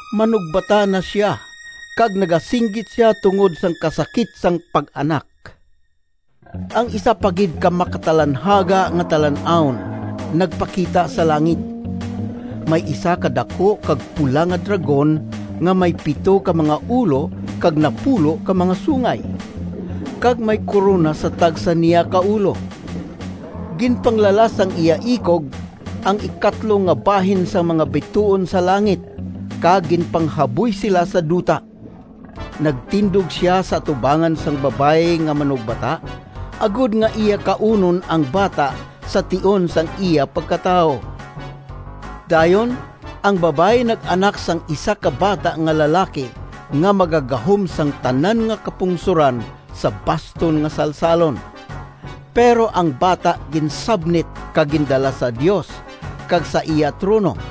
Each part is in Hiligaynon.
Manugbata na sia, kag nagasinggit sia tungod sang kasakit sang pag-anak. Ang isa pa gid ka makatalanhaga nga talan-awon nagpakita sa langit. May isa ka daku kag pula nga dragon nga may pito ka mga ulo kag napulo ka mga sungay, kag may korona sa tagsa niya ka ulo. Ginpanglalas sang iya ikog ang ikatlo nga bahin sang mga bituon sa langit kag ginpanghaboy sila sa duta. Nagtindog sia sa atubangan sang babayi nga manugbata, agod nga iya kaunon ang bata sa tion sang iya pagkatawo. Dayon ang babayi nag-anak sang isa ka bata nga lalaki nga magagahom sang tanan nga kapungsoran sa baston nga salsalon. Pero ang bata ginsabnit kag gindala sa Dios kag sa iya trono.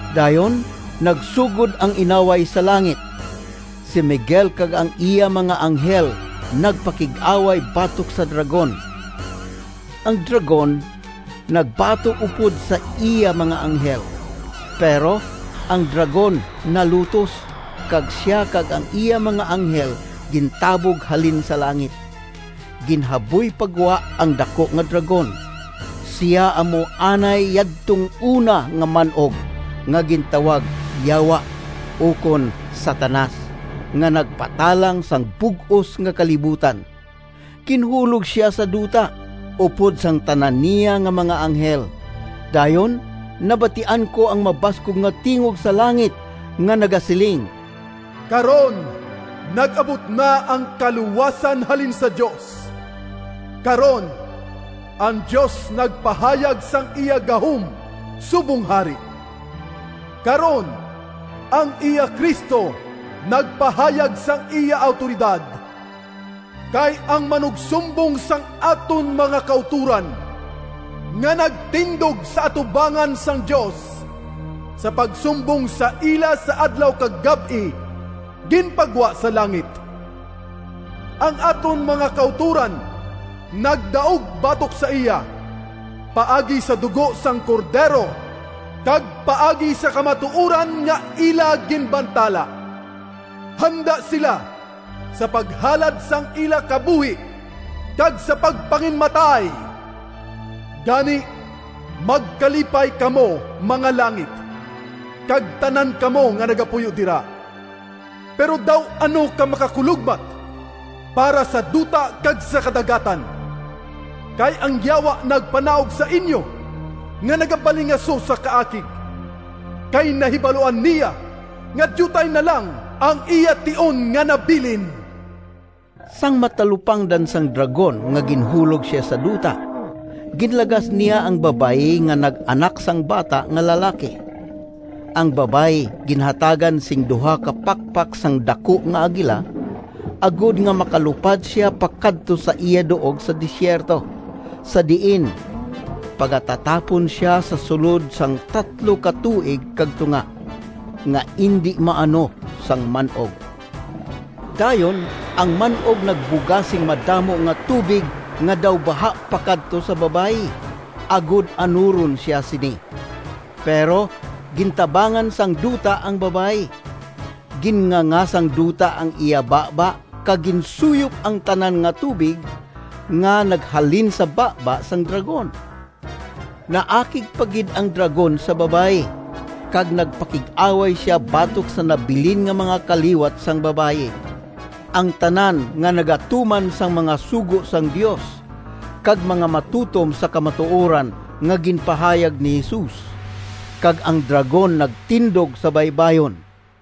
Dayon nagsugod ang inaway sa langit. Si Miguel kag ang iya mga anghel nagpakig-away batok sa dragon. Ang dragon nagbato upod sa iya mga anghel. Pero ang dragon nalutos, kag sia kag ang iya mga anghel gintabog halin sa langit. Ginhaboy pa gwa ang daku nga dragon! Sia amo anay yadtong una nga man-og, nga gintawag Yawa ukon Satanas, nga nagpatalang sang bug-os nga kalibutan. Ginhulog sia sa duta, upod sang tanan niya nga mga anghel. Dayon nabatian ko ang mabaskog nga tingog sa langit nga nagasiling, “Karon nag-abot na ang kaluwasan halin sa Dios! Karon ang Dios nagpahayag sang iya gahom subong Hari! Karon ang iya Cristo nagpahayag sang iya awtoridad! Kay ang manugsumbong sang aton mga kautoran, nga nagtindog sa atubangan sang Dios sa pagsumbong sa ila sa adlaw kag gab-i, ginpagwa sa langit. Ang aton mga kautoran nagdaog batok sa iya paagi sa dugo sang Cordero, kag paagi sa kamatuoran nga ila ginbantala. Handa sila sa paghalad sang ila kabuhi kag sa pagpanginmatay. Gani, magkalipay kamo, mga langit, kag tanan kamo nga nagapuyo dira! Pero daw ano ka makakulogmat para sa duta kag sa kadagatan! Kay ang Yawa nagpanaog sa inyo, nga nagabalingaso sa kaakig, kay nahibaluan niya nga diutay na lang ang iya tion nga nabilin.” Sang matalupangdan sang dragon nga ginhulog sia sa duta, ginlagas niya ang babayi nga nag-anak sang bata nga lalaki. Ang babayi ginhatagan sing duha ka pakpak sang daku nga agila, agod nga makalupad sia pakadto sa iya duog sa desierto, sa diin pagatatapon sia sa sulod sang tatlo ka tuig kag tunga, nga indi maano sang man-og. Dayon ang man-og nagbuga sing madamo nga tubig nga daw baha pakadto sa babayi, agod anuron sia sini. Pero gintabangan sang duta ang babayi. Ginnganga sang duta ang iya baba kag ginsuyop ang tanan nga tubig nga naghalin sa baba sang dragon. Naakig pa gid ang dragon sa babayi, kag nagpakig-away sia batok sa nabilin nga mga kaliwat sang babayi, ang tanan nga nagatuman sang mga sugo sang Dios kag mga matutom sa kamatuoran nga ginpahayag ni Jesus. Kag ang dragon nagtindog sa baybayon.